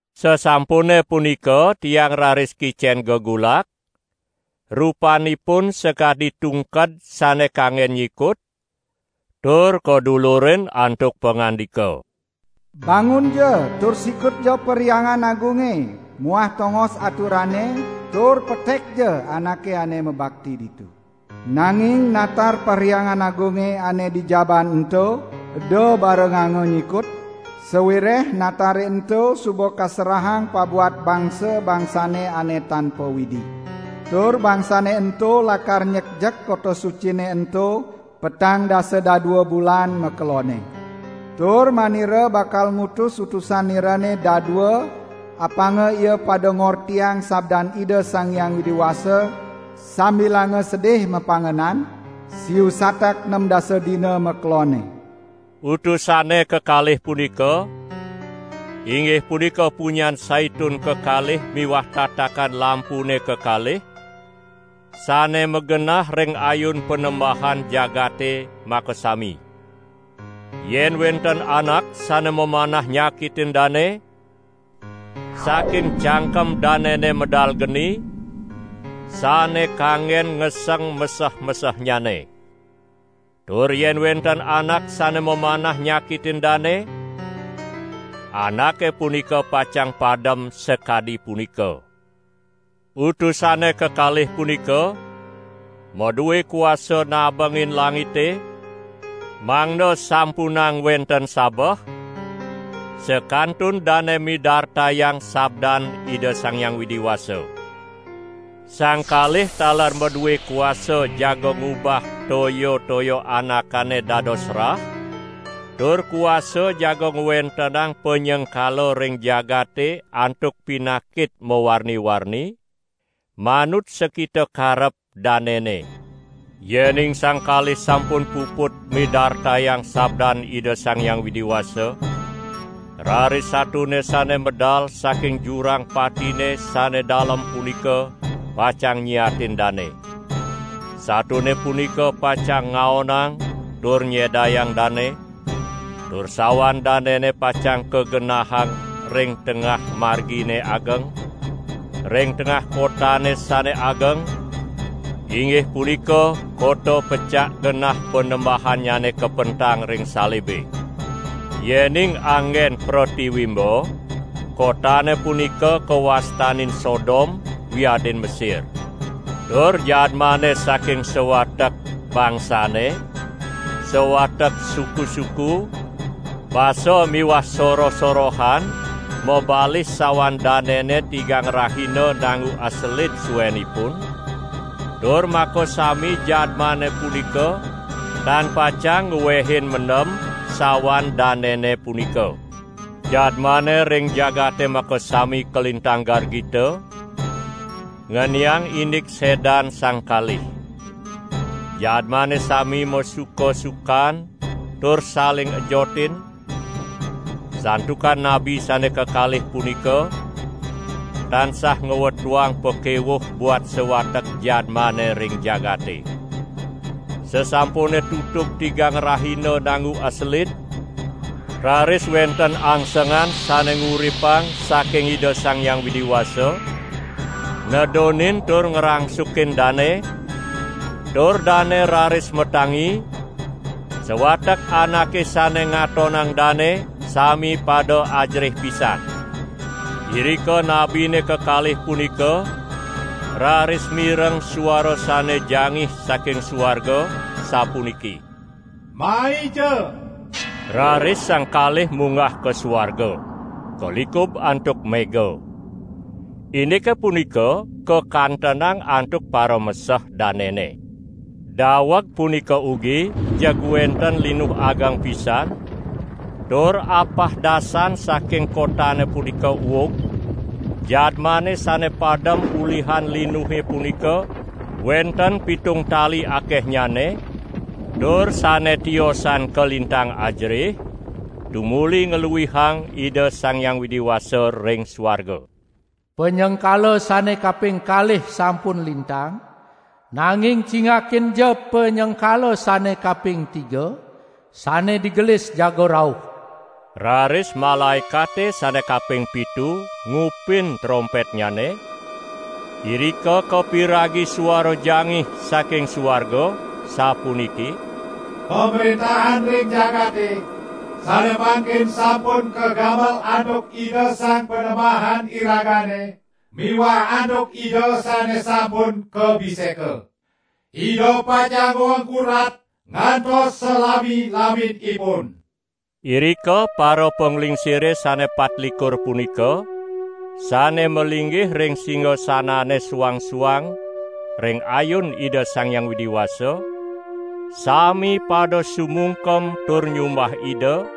Sasampune punika tiang raris kicen gegulak, rupanipun sakadi tungked sane kanggen nyikut, tur kadulurin antuk pangandika: "Bangunja tur sikutja Perhyangan Agunge muah tongos aturane tur petekja anake ane mabakti ditu. Nanging natar Perhyangan Agunge ane di jabaan ento eda barenganga nyikut, sawireh natare ento suba kaserahang pabuat bangsa-bangsane ane tan pa-Widi. Tur bangsane ento lakar nyekjek kota sucine ento petang dasa dadua bulan makelonne. Tur manira bakal ngutus utusan nirane dadua apanga ia pada ngortiang sabdan Ida Sang Hyang Widi Wasa sambilanga sedih mapangenan, siu satak nem dasa dina makelonne." Utusane kekalih punika, inggih punika punyan saitun kekalih miwah tatakan lampune kekalih sane magenah ring ayun Panembahan jagate makasami. Yen wenten anak sane mamanah nyakitin dane, saking cangkem danene medal geni, sane kanggen ngeseng meseh-mesehnyane. Tur yen wenten anak sane mamanah nyakitin dane, anake punika pacang padem sakadi punika. Utusane kekalih punika madue kuasa nabengin langite mangda sampunang wenten sabeh sakantun dane midartayang sabdan Ida Sang Hyang Widi Wasa. Sang kalih taler madue kuasa jaga ngubah toya-toya anakane dados rah, tur kuasa jaga ngwentenang panyengkala ring jagate antuk pinakit mawarni-warni, manut sakita karep danene. Yening sang kalih sampun puput midartayang sabdan Ida Sang Hyang Widi Wasa, raris satone sane medal saking jurang patine sane dalem punika pacang nyiatin dane. Satone punika pacang ngaonang tur nyedayang dane, tur sawan danene pacang kagenahang ring tengah margine ageng, ring tengah kotane sane ageng, inggih punika kota pecak genah Panembahannyane kapentang ring salibe. Yening anggen pretiwimba, kotane punika kawastanin Sodom wiadin Mesir. Tur jadmane saking sawatek bangsane, sawatek suku-suku, basa miwah soroh-sorohan mabalih sawan danene tigang rahina nanggu aselid suenipun, tur makasami jadmane punika tan pacang nguehin mendem sawan danene punika. Jadmane ring jagate makasami kalintang gargita, ngeniang indik sedan sang kalih. Jadmane sami masuka-sukan tur saling ejotin, santukan nabi sane kekalih punika tansah ngwetuang pakewuh buat sawatek jadmane ring jagate. Sasampune tutug tigang rahina nanggu aselid, raris wenten angsengan sane nguripang saking Ida Sang Hyang Widi Wasa nedunin tur ngrangsukin dane, tur dane raris matangi, sawatek anake sane ngatonang dane, sami pada ajerih pisan. Irika nabine kekalih punika raris mireng suara sane jangih saking suarga, sapuniki: "Maija!" Raris sang kalih munggah ka suarga, kalikub antuk mega. Indike punika kakantenang antuk parameseh danene. Daweg punika ugi jeg wenten linuh ageng pisan, tur apah dasan saking kotane punika uug, jadmane sane padem ulihan linuhe punika wenten pitung tali akehnyane, tur sane tiosan kalintang ajerih, tumuli ngluihang Ida Sang Hyang Widi Wasa ring suarga. Panyengkala sane kaping kalih sampun lintang, nanging cingakinja panyengkala sane kaping tiga, sane digelis jaga rauh. Raris malaekate sane kaping pitu ngupin trompetnyane, irika kapiragi suara jangih saking suarga, sapuniki: "Pamrentahan ring jagate sane mangkin sampun kagamel antuk Ida Sang Panembahan iragane miwah antuk Ida sane sampun kabiseka. Ida pacang ngwengku rat ngantos salami-laminipun." Irika parapanglingsire sane patlikur punika sane malinggih ring singasanannyane suang-suang ring ayun Ida Sang Hyang Widi Wasa, sami pada sumungkem tur nyumbah Ida,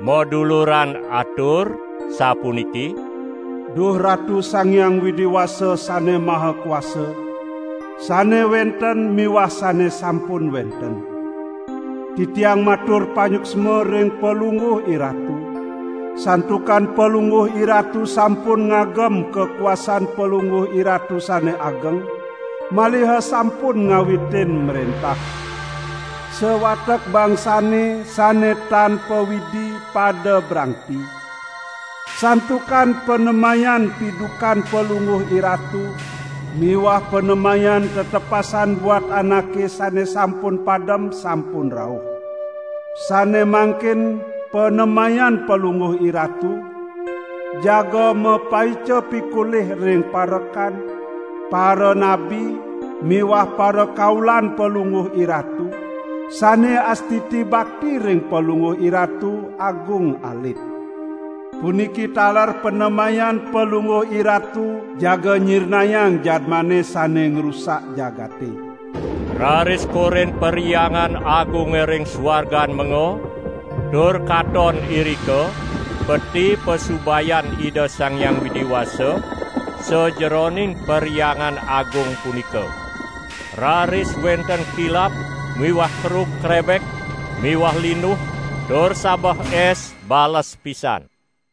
maduluran atur sapuniki: "Duh Ratu Sang Hyang Widi Wasa Sane Maha Kuasa, sane wenten miwah sane sampun wenten. Titiang matur panyuksma ring Palungguh IRatu, santukan Palungguh IRatu sampun ngagem kakuasan Palungguh IRatu sane ageng, maliha sampun ngawitin mrentah. Sawatek bangsane sane tan pa-Widi pada brangti, santukan panemayan pidukan Palungguh IRatu miwah panemayan tetepasan buat anake sane sampun padem sampun rauh. Sane mangkin panemayan Palungguh IRatu, jaga mapaica pikolih ring parekan, paranabi miwah parakaulan Palungguh IRatu, sane astiti bakti ring Palungguh IRatu, agung alit. Puniki taler panemayan Palungguh IRatu jaga nyirnayang jadmane sane ngrusak jagate. Raris korin Perhyangan Agunge ring suargan menga, tur katon irika peti pasubayan Ida Sang Hyang Widi Wasa sajeroning Perhyangan Agung punika. Raris wenten kilap miwah kerug krebek miwah linuh tur sabeh es bales pisan.